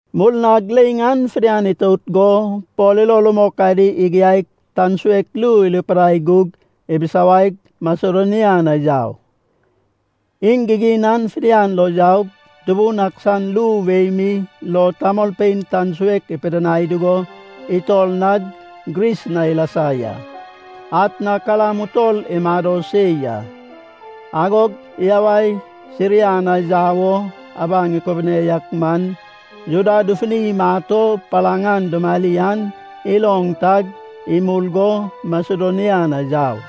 Murnag leiŋ an fidian itout go Pol ilo rumok adi igiaig, tan suek ru irupidai gug ibisawaig, Masedonia na yau. Iŋ gigin an fidian lo yaug, Tubun ak san ru wei mi lo tamolpein tan suek ipidinai dugo itor nag Gris na ilasa ya. Atna kalam utol imado se ya. Agog iyawai Siria na yau o abaŋ ikubune yak man, Juda dufuni imat o palaŋ an dumari an iloŋ tag, imul go Masedonia na yau.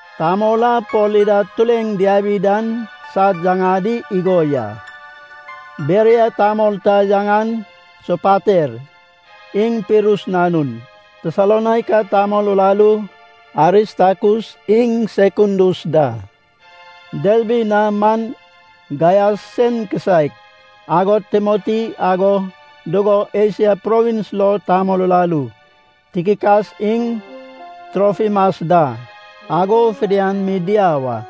Tamol a Pol ida tureŋ diabi dan sad yaŋadi igo ya: Beria tamol ta yaŋan Sopater iŋ Pirus nanun. Tesalonaika tamol uraru Aristakus iŋ Sekundus da. Derbi na man Gaias sen kisaek. Agod Timoti, ago dugo Esia provins lo tamol uraru Tikikas iŋ Trofimas da ago fidian mi diau a.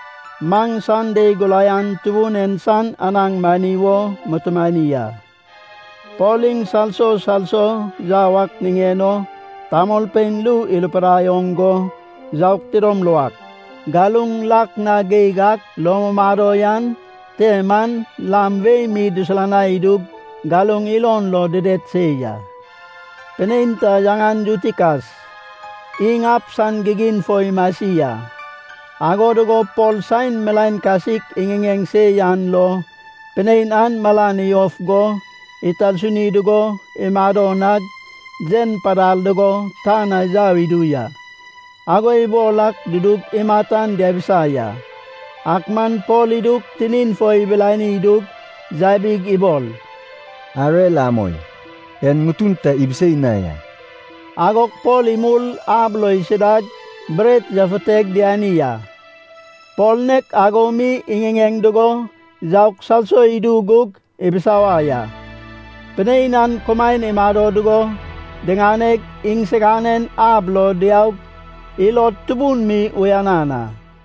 Maŋ Sande guraian Tubun en san anaŋ mani wo mutumani a. Pol iŋ salso salso yau ak niŋen o tamolpein ru irupidai oŋ go yaug tidom luak. Galuŋ lak na geig ak lo mumado yan te man lam wei mi dusulanai idug galuŋ ilon lo dided se ya. Pinein ta yaŋan Yutikas iŋ ab san gigin fo imasi a. Ago dugo Pol saen milaen kasik iŋiŋeŋ se yan lo, pinein an malan iyof go itarsuni dugo imado nag, yen padal dugo tan na yau idu ya. Ago ibol ak dudug imat an diabisa ya. Ak man Pol idug, tinin fo ibilani idug, yabig ibol, “Arer amoi. En ŋutun ta ibisei na ya.” Agog Pol imul ab lo isidag bret yafuteg diani a. Pol nek ago mi iŋiŋeŋ dugo yaug salso idu gug ibisawai a. Pinein an kumaen imado dugo diŋaneg iŋsiganen ab lo diaug ilod tubun mi uyanan a.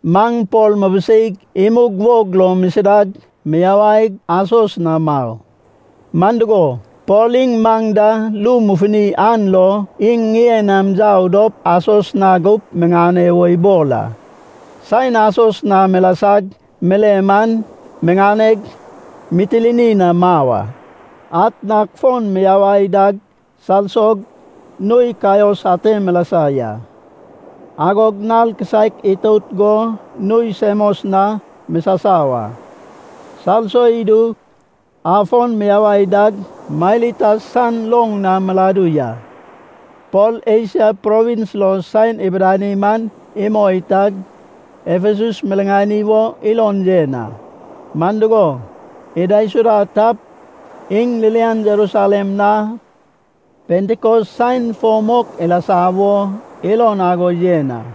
Maŋ Pol mibiseig imug wog lo misidag miyawaig Asos na mau. Man dugo, Pol iŋ maŋ da ru mufuni an lo, iŋ ŋien nam yau dop Asos na gup miŋane wo ibol a. Saen Asos na milasag mile man miŋaneg Mitilini na mau a. Atnag fon miyawai dag salsog nui Kaios ate milasa ya. Agog nal kisaek itout go nui Semos na misasau a. Salso idug afon miyawai dag Mailitas san loŋ na miladu ya. Pol Esia Provins lo saen ibidani man imoi tag, Efesus miriŋani wo ilon yen a. Man dugo, idaisuda tap, iŋ ririan Jerusalem na Pentikos saen fo mok ilasa wo ilon ago yen a.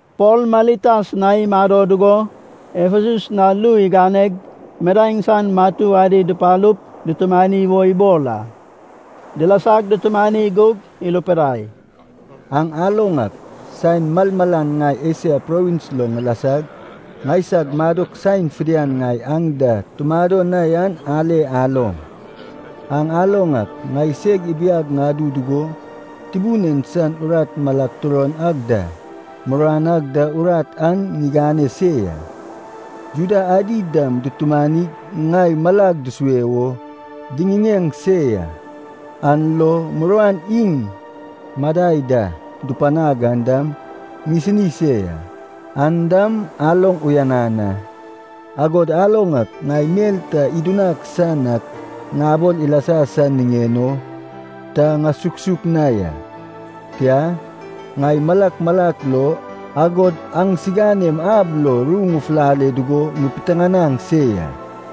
Pol Mailitas na imado dugo Efesus na ru iganeg, midaeŋ san matu adi dupalup dutumani wo ibol a. Dilasag dutumani gug irupidai, “Aŋ aloŋ ak, saen malmalan ŋai Esia provins lo ŋilasag, ŋaisag madok saen fidian ŋai aŋ da tumado na yan ale aloŋ. Aŋ aloŋ ak, ŋaiseg ibiag ŋadu dugo, Tubun en san urat malag turon ag da, muruan ag da urat an ŋigane se ya. Juda adi dam dutumanig ŋai malag dusue wo diŋiŋeŋ se ya, an lo muruan iŋ madai da dupanag an dam ŋisini se ya. An dam aloŋ uyanan a. Agod aloŋ ak, ŋai mel ta idunaŋ san ak ŋabol ilasa san niŋen o ta ŋusuksuk na ya. Tia, ŋai malak malak lo, agod aŋsiganem ab lo ru ŋufulale dugo ŋipiteŋanaŋ se ya.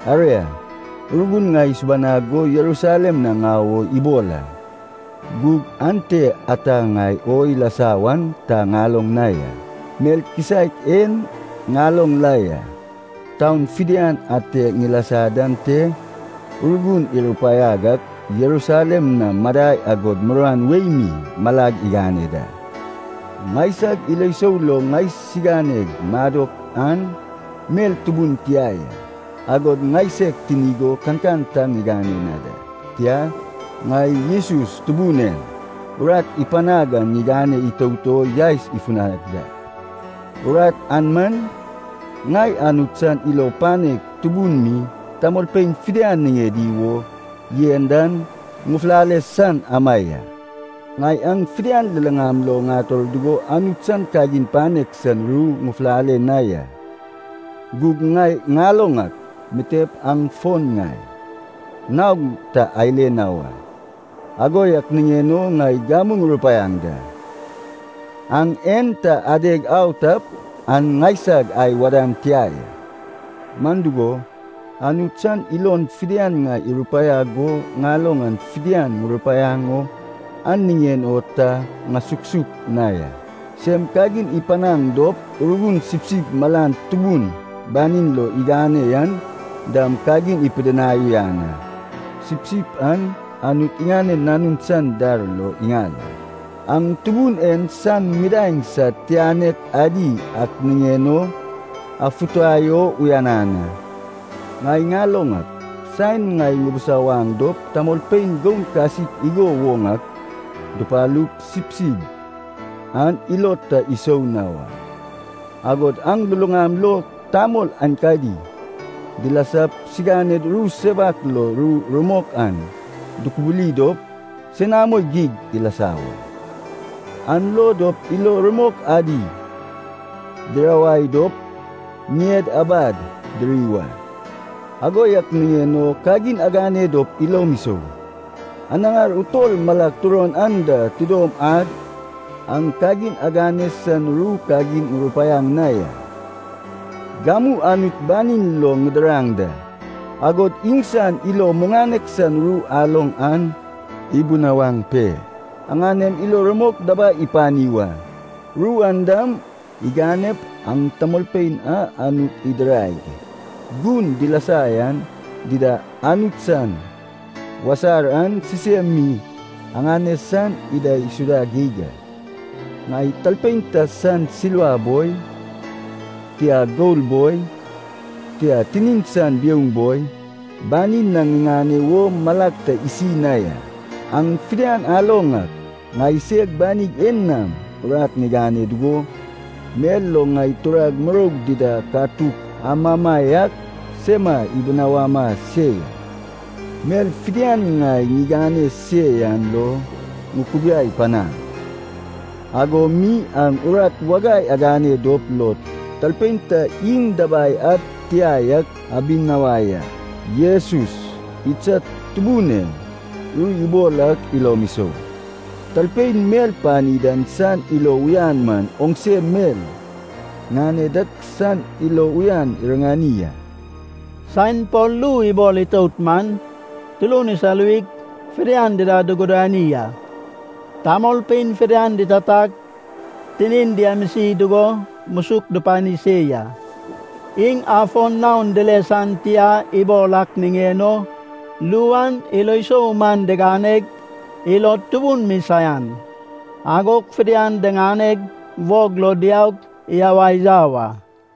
“Aria, Urgun ŋai isubanag go Jerusalem na ŋau o ibol a. Gug ante ata ŋai o ilasa wan ta ŋaloŋ na ya. Mel kisaek en ŋaloŋ la ya, taun fidian ate ŋilasa dan te Urgun irupaiag ak Jerusalem na madai agod muruan wei mi malag igane da. Ŋaisag ilo sou lo ŋaisiganeg madok an mel tubun tia ya, agod ŋaiseg tinig o kankan ta ŋigane na da. Tia, ŋai Jesus Tubun en urat ipanag an ŋigane itout o yaes ifunag da. Urat an man, ŋai Anut san ilo panek tubun mi tamolpein fidian niŋedi wo yen dan ŋufulale san ama ya. “Ŋai aŋ fidian luluŋam lo ŋator dugo Anut san kagin panek san ru ŋufulale na ya. Gug ŋai ŋaloŋ ak, mitep aŋ fon ŋai naog ta ale na wa. Ago yak niŋen o ŋai gamu ŋurupaiaŋ da. Aŋ en ta adeg au tap an ŋaisag ai wadan tia ya. Man dugo, Anut san ilon fidian ŋai irupaiag go ŋaloŋ an fidian ŋurupaiaŋ o an niŋen o ta ŋasuksuk na ya. Sem kagin ipanaŋ dop Urgun sipsip malan tubun banim lo igane yan dam kagin apidinai uyanan a. Sipsip an Anut iŋanen Nanun san dar lo iŋal a. Aŋ Tubun en san midaeŋ sad titianek adi ak niŋen o afutai o uyanan a. Ŋai ŋaloŋ ak, saen ŋai ŋubusawaŋ dop tamolpein goun kasik igo woŋ ak dupalup, sipsip an ilod ta isou na wa. Agod aŋ luluŋam lo tamol aenkadi dilasap siganed ru sewak lo ru rumok an dukubuli dop senamo geig ilasa wa, an lo dop ilo rumok adi dirawai dop ŋied abad diri wa. Ago yak niŋen o kagin agane dop ilom isou. Anaŋar utol malag turon anda tidom ad aŋ kagin agane san ru kagin ŋurupaiaŋ na ya. “Gamu Anut banin lo ŋidiraŋ da. Agod iŋsan ilo muŋanek san ru aloŋ an ibunawaŋ pe, aŋanem ilo rumok dabai ipani wa. Ru an dam iganep aŋ tamolpein a Anut idiraig gun dilasa yan dida Anut san wasar an sisem mi aŋane san idaisuda geig a. Ŋai talpein ta san silva boi, tia gol boi, tia tinin san biouŋ boi, banin na ŋiŋane wo malag ta isi na ya. Aŋ fidian aloŋ ak, ŋaiseg banig en nam urat ŋigane dugo, mel lo ŋai turag dida katuk amama yak sema ibunawama se ya. Mel fidian ŋai ŋigane se yan lo ŋukubiai panaŋ, ago mi aŋ urat wagai agane dop lo talpein ta iŋ dabai ad tia yak abinawai a. Jesus, idsad Tubun en, ru ibol ak ilom isou. ‘Talpein mel pani dan san ilo uyan man oŋse mel ŋane dak san ilo uyan iriŋani a.’” Saen Pol ru ibol itout man, turun isaluwig fidian dida dugudani a. Tamolpein fidian ditatag, tinin diamisi dugo musuk dupani se ya. Iŋ afon naon dile san tia ibol ak niŋen o ru an ilo sou man diganeg, ilod tubun mi saian. Agog fidian diŋaneg, wog lo diaug, iyawai yau a.